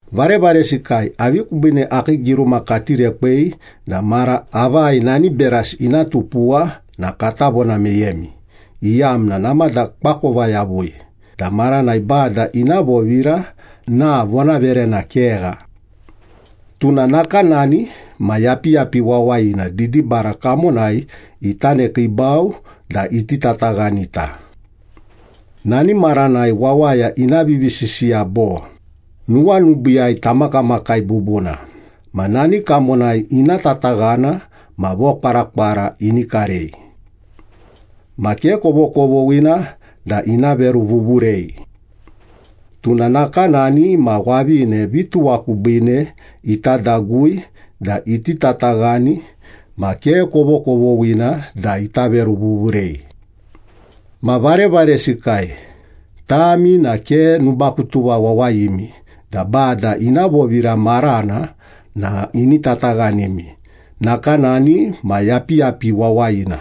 Varevaresikai, avi kubiine akii giruma kati rekwei da mara avai nani berasi ina tupuwa na kata vona meyemi, iyamna namada koakova yavui da maranai Bada ina vovira na vonaverena kegha. Tuna nakanani ma yapiyapi wawayina didibara kamonai ita nekiibau da iti tataghanita. Nani maranai wawaya ina vivisisiya bo, “Nuwanubiiyai tamakamakai bubuna,” ma nani kamonai ina tataghana ma vokwarakwara ini karei. Ma ke kovokovoghina da ina veruvuvurei. Tuna nakanani ma wavine vituwa kubiine ita dagui da iti tataghani ma ke kovokovoghina da ita veruvuvurei. Ma varevaresikai, tami na ke nubakutuva wawayimi da Bada ina vovira marana na ini tataghanimi nakanani ma yapiyapi wawayina.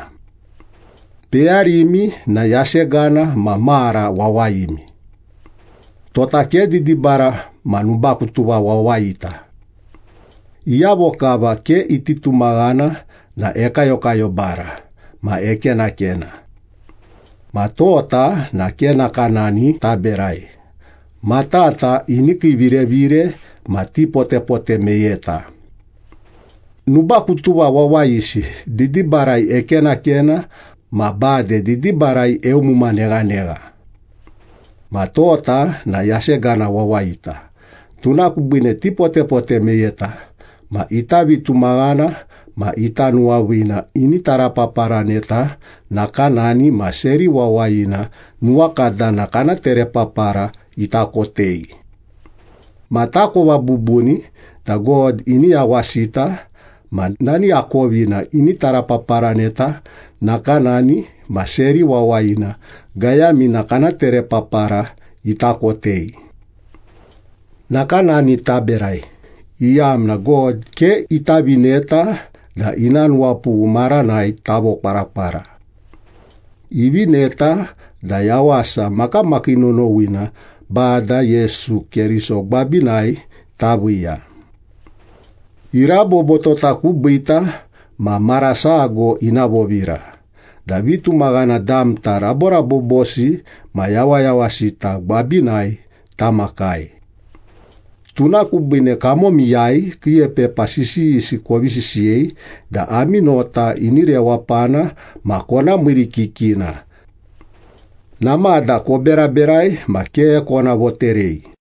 Peyarimi na yasegana ma mara wawayimi. Tota ke didibara ma nubakutuva wawayita. Iyavo kava ke iti tumaghana na ekayokayobara ma ekenakena. Ma tota na ke nakanani taberai, matata ini kiivirevire ma tipotepote meyeta. Nubakutuva wawayisi didibarai ekenakena ma bade didibarai eumuma neghanegha. Ma tota na yasegana wawayita, tuna kubiine tipotepote meyeta, ma ita vitumaghana ma ita nuwaviina ini tarapaparaneta nakanani ma seri wawayina nuwakadana kana terepapara ita kotei. Ma takova bubuni da God ini yawasita ma nani akovina ini tarapaparaneta nakanani ma seri wawayina gayamina kana terepapara ita kotei. Nakanani taberai, iyamna God ke ita vineta da ina nuwapughu maranai tavokwarakwara. Ivineta da yawasa makamakii nonowina Bada Yesu Keriso gwabinai taviiya. Irabobo tota kubiita ma mara sago ina vovira, da vitumaghana damta raborabobosi ma yawayawasita gwabinai tamakai. Tuna kubiine kamomiyai kiiepepa sisiyisi kovi sisiyei da ami nota ini rewapana ma kona miirikikina. Namada koberaberai ma ke kona voterei.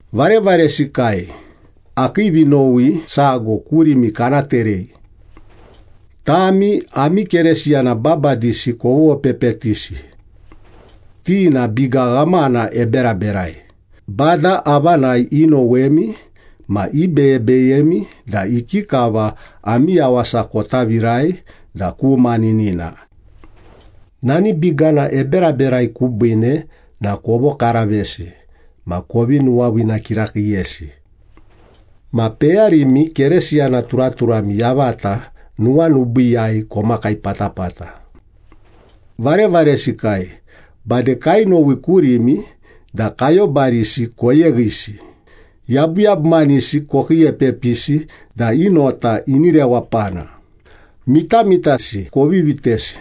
Varevaresikai, akii vinowi sago kurimi kana terei. Tami ami Keresiyana babadisi kovopepetisi. Ti na biga ghamana eberaberai, Bada avanai inowemi, ma ibeyebeyemi da ikikava ami yawasa kota virai da ku maninina. Nani bigana eberaberai kubiine na kovokaravesi ma kovi nuwaviina kirakiiyesi. Ma peyarimi Keresiyana turaturami yavata nuwanubiiyai komakai patapata. Varevaresikai, bade kainowi kurimi da kayobarisi koyeghisi, yabuyabumanisi kokiiepepisi da i nota ini rewapana, mitamitasi kovi vitesi,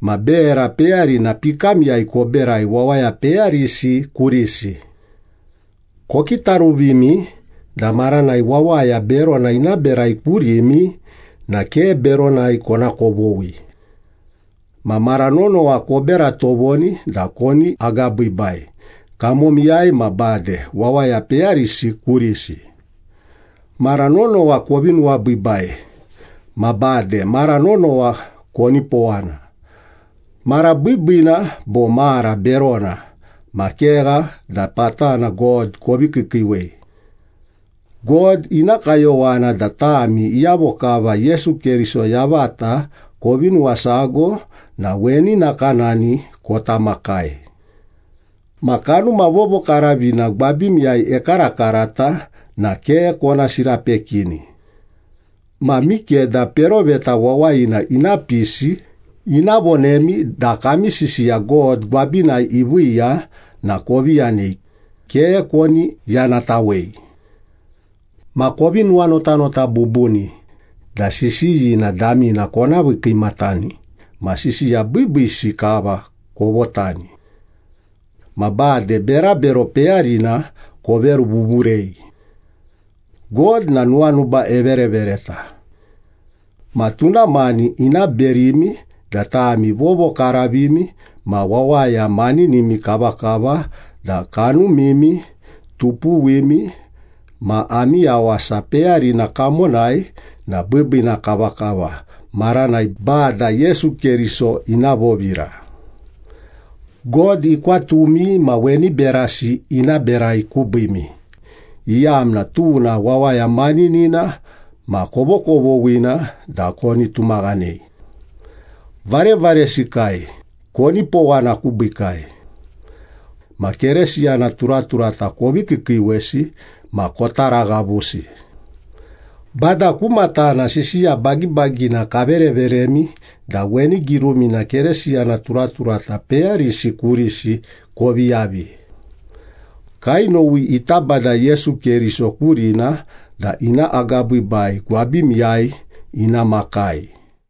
ma bera peyarina pikamiyai koberai wawaya peyarisi kurisi. Kokitaruvimi da maranai wawaya berona ina berai kurimi na ke beronai kona kovoghi. Ma mara nonowa kobera tovoni da koni agabiibai, kamomiyai ma bade wawaya peyarisi kurisi. Mara nonowa kovi nuwabiibai. Ma bade mara nonowa konipowana. Mara biibiina bo mara berona ma kegha da patana God kovi kiikiiwei. God ina kayowana da tami iyavo kava Yesu Keriso yavata kovi nuwasago na weni nakanani kota makai. Ma Kanuma Vovokaravina gwabimiyai ekarakarata na ke kona sirapekini. Ma mikeda peroveta wawayina ina pisi, ina vonemi da kami sisiya God gwabinai iviiya na kovi yanei, ke koni yanatawei. Ma kovi nuwanotanota bubuni da sisiyina damina kona vii kiimatani ma sisiya biibiisi kava kovotani. Ma bade berabero peyarina koveruvuvurei. God na nuwanuba everevereta. Ma tuna mani ina berimi da tami vovokaravimi ma wawaya maninimi kavakava da kanumimi, tupuwimi ma ami yawasa peyarina kamonai na biibiina kavakava maranai Bada Yesu Keriso ina vovira. God ikwatumi ma weni berasi ina berai kubiimi, iyamna tuna wawaya maninina ma kovokovoghina da koni tumaghanei. Varevaresikai, konipowana kubiikai. Ma Kerisiyana turaturata kovi kiikiiwesi ma kotaraghavusi. Bada ku matana, sisiya bagibagina kavereveremi da weni girumina Keresiyana turaturata peyarisi kurisi kovi yavi. Kainowi ita Bada Yesu Keriso kurina da ina agabiibai gwabimiyai ina makai.